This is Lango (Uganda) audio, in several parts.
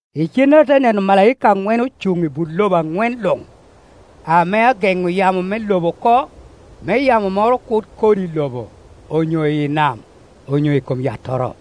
Icennere ate neno omalaika aŋwen ocuŋ i but lobo aŋwen luŋ, ame ageŋo yamo me lobo oko, me yabo moro kur kod i lobo, onyo i nam, onyo i kom yattoro.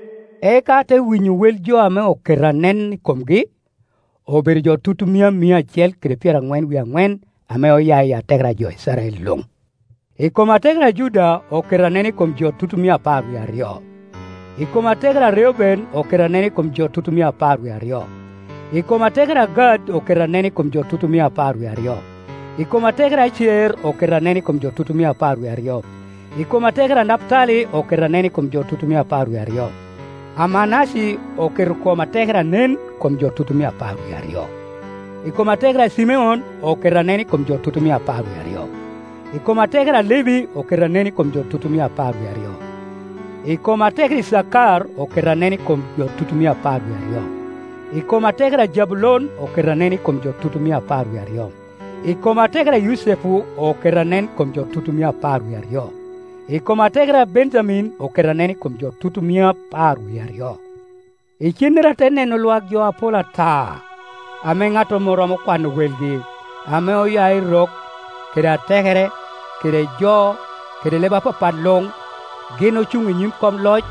Eka ate winyo wel jo ame oketo anen i komgi, obedo jo tutumia mia acel kede pyeraŋwen wie aŋwen, ame oya i atekere jo Icrael luŋ. I kom atekere a Juda oketo anen i kom jo tutumia apar wie aryo, I kom atekere a Rcuben oketo anen i kom jo tutumia apar wie aryo, I kom atekere a Gad oketo anen i kom jo tutumia apar wie aryo. I kom atekere Acer oketo anen i kom jo tutumia apar wie aryo. I kom atekere a Naputali oketo anen i kom jo tutumia apar wie aryo, a Manace oketo I kom atekere anen i kom jo tutumia apar wie aryo. I kom atekere a Cimeon oketo anen i kom jo tutumia apar wie aryo. I kom atekere a Levi oketo anen i kom jo tutumia apar wie aryo. I kom atekere Icakar oketo anen i kom jo tutumia apar wie aryo. I kom atekere a Jabulon oketo anen i kom jo tutumia apar wie aryo. I kom atekere a Yucepu oketo anen i kom jo tutumia apar wie aryo, I kom atekere a Benjamin oketo anen i kom jo tutumia par wie aryo. Icennere ate neno lwak jo apol ata, ame ŋattoro mom romo kwano welgi, ame oya i rok, kede atekere, kede jo, kede leb apapat luŋ. Gin ocuŋ i nyim kom Ioc,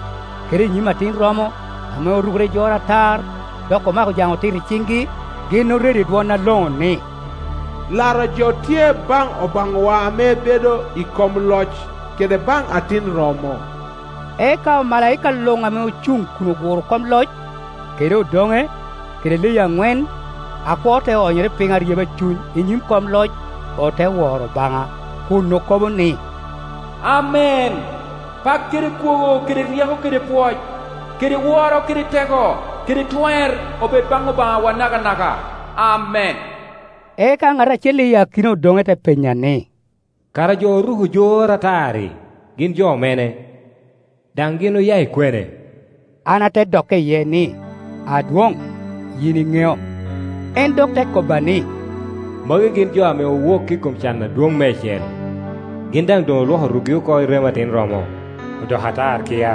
kede i nyim Atin romo, ame orukere i jor atar, dok omako jaŋ otit i ciŋgi. Gin oredo i dwon aloŋo ni, “Laro jo tye baŋ Obaŋawa ame bedo i kom loc, kede baŋ Atin romo!” Eka omalaika luŋ ame ocuŋ kun oguro kom loc, kede odoŋe, kede leyi aŋwen, akwo te onyere piny aryeba cuny i nyim kom loc, ote woro Obaŋa, kun okobo ni, “Amen! Pak kede kwogo kede ryeko kede pwoc, kede woro kede teko kede twer obed baŋ Obaŋawa nakanaka. Amen.” Eka ŋat acel akina i odoŋe te penya ni, “Kara jo oruko jor atar-ri, gin jo mene, daŋ gin oya i kwene?” An ate dokke iye ni, “Adwoŋ, yin iŋeo.” En dok te kobba ni, “Magi gin jo ame owok i kom can adwoŋ meicel, gin daŋ doŋ olwoko rukgi oko i remo Atin romo, odoko atar kia.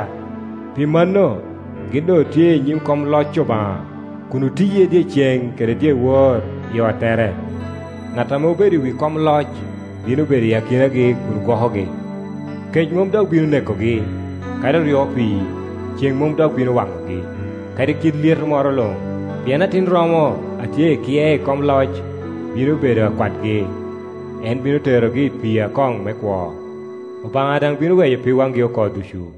Pi mano, gin doŋ otye i nyim kom loc Obaŋa kun otiye dyeceŋ kede dyewor i ottete; ŋat ame obedo i wi kom loc bino bedo i akinagi kun gwokogi. Kec mom dok bino nekogi, kadi oryo pii, ceŋ mom dok bino waŋogi, kadi kit lyeto moro luŋ, Pien Atin rom a tye i kye kom loc bino bedo akwatgi; en bino terogi i pii akoŋ me kwo. Obaŋa daŋ bino weyo pig waŋgi oko ducu.”